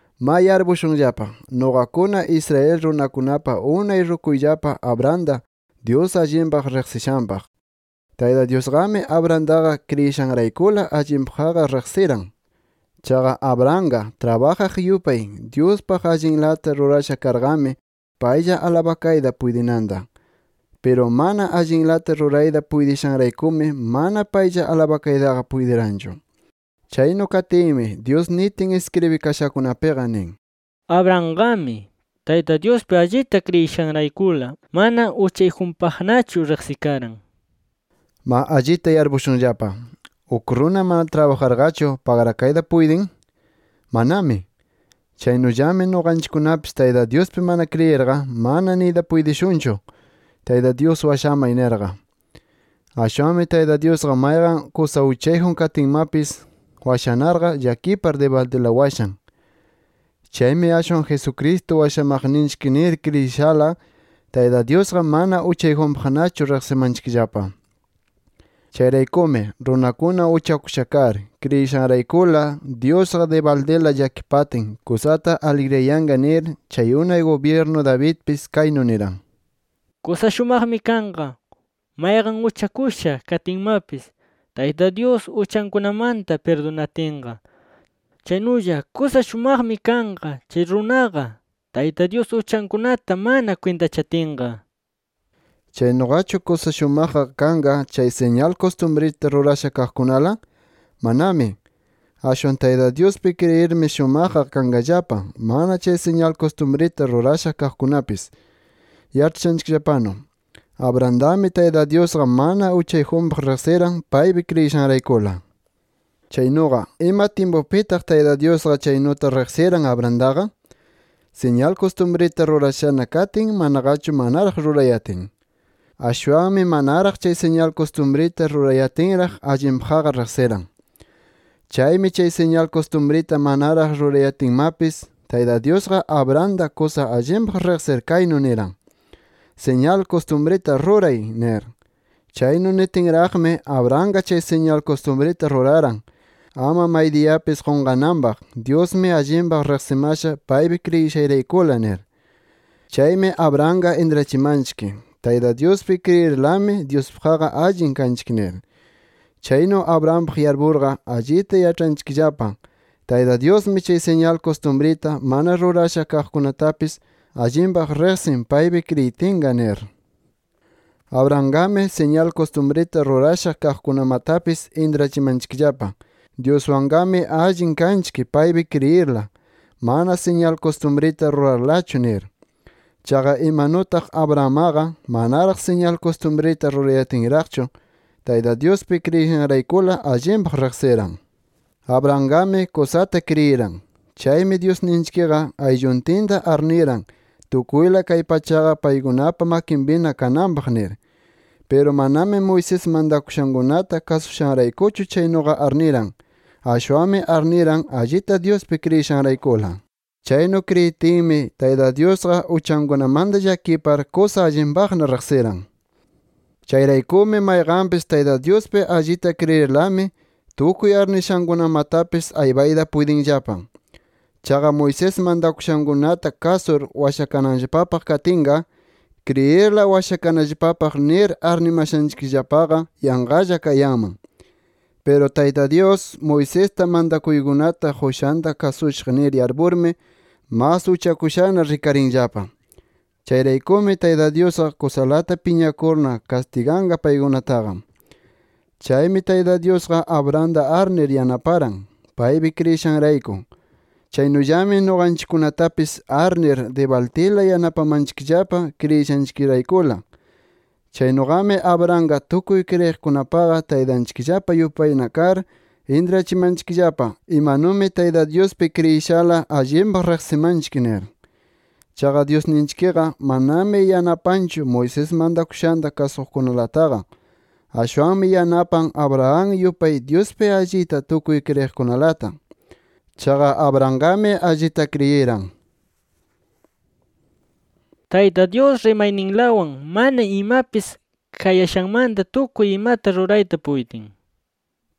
Ma yarpushunllapa, nuqakuna Israel runakunapa unay rukuyllapa Abrahamta, Dyus allinpaq riqsishanpaq. Tayta Dyusqami Abrahamtaqa kriyishanraykula allinpaqqa riqsiran. Chaqa Abrahamqa trabajaq yupay, Dyuspaq allinlata rurasha karqami paylla alabakayta puytinanta. Piru mana allinlata rurayta puytishanraykumi mana paylla alabakaytaqa puytiranchu. Chaynu katinmi Dyus nitin iskribikashakunapiqa nin: “Abrahamqami Tayta Dyuspi allita kriyishanraykula mana uchayjunpaqnachu riqsikaran” nir. Ma allita yarpushunllapa: ¿Uk runa mana trabajarqachu pagrakayta puytin? ¡Manami! Chaynullami nuqanchikkunapis Tayta Dyuspi mana kriyirqa, mana niyta puytishunchu “Tayta Dyus washamay” nirqa. Ashwanmi Tayta Dyusqa mayqan kusa uchayjun katinmapis washanarqa, llakipar dibaldila washan. Chaymi ashwan, Jesucristo washamaqninchik nir kriyishala, Tayta Dyusqa mana uchayjunpaqnachu riqsimanchikllapa. Chayraykumi runakuna uchakusha kar, kriyishanraykula Dyusqa, dibaldila llakipatin kusata aligriyanqa nir, chay unay gubyirnu Davidpis kaynu niran: “Kusa shumaqmi kanqa mayqan uchakusha katinmapis Tayta Dyus uchankunamanta pirdunatinqa. Chaynulla kusa shumaqmi kanqa chay runaqa, Tayta Dyus uchankunata mana kwintachatinqa” nir. ¿Chaynuqachu kusa shumaqqa kanqa chay siñal kustumrita rurasha kaqkunala? ¡Manami! Ashwan Tayta Dyuspi kriyirmi shumaqqa kanqallapa, mana chay siñal kustumrita rurasha kaqkunapis. Yaĉhashanchikllapanu, Abrahamtami Tayta Dyusqa mana uchayjunpaq riqsiran, paypi kriyishanraykula. Chaynuqa ¿ima tyimpupitaq Tayta Dyusqa chaynuta riqsiran Abrahamtaqa? ¿Siñal kustumrita rurashana katin, manaqachu manaraq rurayatin? Ashwanmi manaraq chay siñal kustumrita rurayatinraq, allinpaqqa riqsiran. Chaymi chay siñal kustumrita manaraq rurayatinmapis, Tayta Dyusqa Abrahamta kusa allinpaq riqsir kaynu niran: “Siñal kustumrita ruray” nir. Chaynu nitinraqmi, Abrahamqa chay siñal kustumrita ruraran, ama maydiyapis qunqananpaq, Dyusmi allinpaq riqsimasha paypi kriyishayraykula nir. Chaymi Abrahamqa intrachimanchik, Tayta Dyuspi kriyirlami Dyuspaqqa allin kanchik nir. Chaynu Abrahampaq yarpurqa, allita yaĉhanchikllapa Tayta Dyusmi chay siñal kustumrita mana rurasha kaqkunatapis allinpaq riqsin paypi kriyitinqa nir. Abrahamqami siñal kustumrita rurasha kaqkunamatapis intrachimanchikllapa, Dyuswanqami allin kanchik paypi kriyirla, mana siñal kustumrita rurarlachu nir. Chaqa imanutaq Abrahammaqa manaraq siñal kustumrita rurayatinraqchu Tayta Dyuspi kriyishanraykula, allinpaq riqsiran. Abrahamqami kusata kriyiran. Chaymi Dyusninchikqa aylluntinta arniran tukuyla kay pachaqa paykunapa makinpina kananpaq nir. Piru manami, Moisés mantakushankunata kasushanraykuchu chaynuqa arniran. Ashwanmi arniran, allita Dyuspi kriyishanraykula. Chaynu kriyitinmi, Tayta Dyusqa uchankunamanta llakipar kusa allinpaqna riqsiran. Chayraykumi mayqanpis Tayta Dyuspi allita kriyirlami, tukuy arnishankunamatapis aypayta puytinllapa. Chaqa Moisés mantakushankunata kasur washakananllapapaq katinqa, kriyirla washakanallapapaq nir arnimashanchikllapaqa yanqalla kayanman. Piru Tayta Dyus, Moisesta mantakuykunata qushanta kasushaq nir yarpurmi mas uchakushana rikarinllapa. Chayraykumi Tayta Dyusqa kusalata piñakurna kastiganqa paykunataqa. Chaymi Tayta Dyusqa Abrahamta arnir yanaparan, paypi kriyishanrayku. Chaynullami nuqanchikkunatapis arnir dibaldila yanapamanchikllapa kriyishanchikraykula. Chaynuqami Abrahamqa tukuy kriyiqkunapaqa taytanchikllapa yupayna kar intrachimanchikllapa, imanumi Tayta Dyuspi kriyishala allinpaq riqsimanchik nir. Chaqa Dyusninchikqa manami yanapanchu Moisés mantakushanta kasuqkunalataqa. Ashwanmi yanapan Abraham yupay Dyuspi allita tukuy kriyiqkunalata. Chaqa Abrahamqami allita kriyiran: Tayta Dyus rimayninlawan mana imapis kayashanmanta tukuy imata rurayta puytin nir.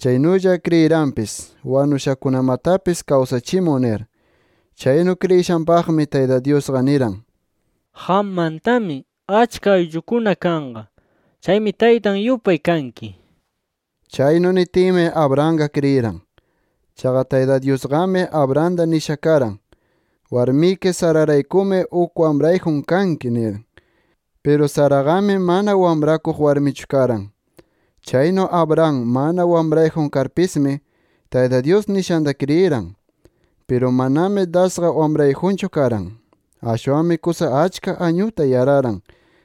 Chaynulla kriyiranpis: Wanushakunamatapis kawsachimun nir. Chaynu kriyishanpaqmi Tayta Dyusqa niran: “Qammantami achka ayllukuna kanqa. Chaymi taytan yupay kanki” nir. Chaynu nitinmi Abrahamqa kriyiran. Chaqa Tayta Dyusqami Abrahamta nisha karan: “Warmiki Sararaykumi uk wamrayjun kanki” nir. Piru Saraqami mana wamrakuq warmichu karan. Chaynu Abraham mana wamrayjun karpismi, Tayta Dyus nishanta kriyiran. Piru manami dasqa wamrayjunchu karan. Ashwanmi kusa achka añuta yararan,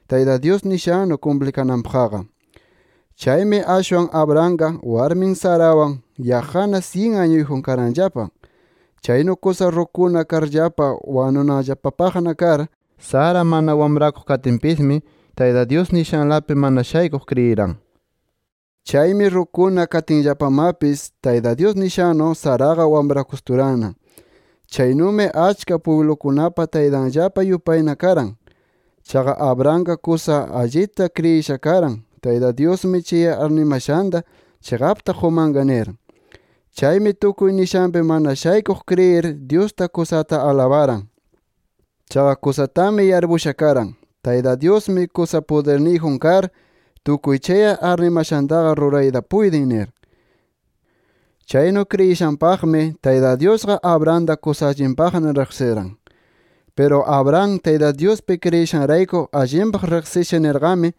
Tayta Dyus nishannu kumplikananpaqqa. Chaymi ashwan Abrahamqa warmin Sarawan yaqqana syin añuyjun karanllapa. Chaynu kusa rukuna karllapa wanunanllapapaqna kar, Sara mana wamrakuq katinpismi, Tayta Dyus nishanlapi mana shaykuq kriyiran. Chaymi rukuna katinllapamapis Tayta Dyus nishannu, Saraqa wamrakusturanna. Chaynumi achka pwiblukunapa taytanllapa yupayna karan. Chaqa Abrahamqa kusa allita kriyisha karan: Tayta Dyusmi chay arnimashanta chiqapta qumanqa nir. Chaymi tukuy nishanpi mana shaykuq kriyir, Dyusta kusata alabaran. Chaqa kusatami yarpukusha karan: Tayta Dyusmi kusa pudirniyjun kar, tukuy chay arnimashantaqa rurayta puytin nir. Chaynu kriyishanpaqmi Tayta Dyusqa Abrahamta kusa allinpaqna riqsiran. Piru Abraham, Tayta Dyuspi kriyishanrayku allinpaq riqsisha nirqami,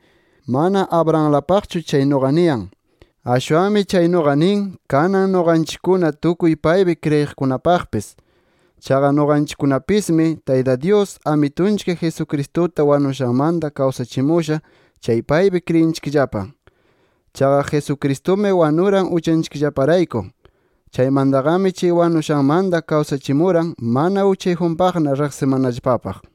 mana Abrahamlapaqchu chaynuqa niyan. Ashwanmi chaynuqa nin, kanan nuqanchikkuna tukuy paypi kriyiqkunapaqpis. Chaqa nuqanchikkunapismi, Tayta Dyus, Amitunchik Jesucristuta wanushanmanta kawsachimusha chay paypi kriyinchikllapa. Chaqa Jesucristumi wanuran uchanchikllaparayku. Chaymantaqami chay wanushanmanta kawsachimuran, mana uchayjunpaqna riqsimanallapapaq.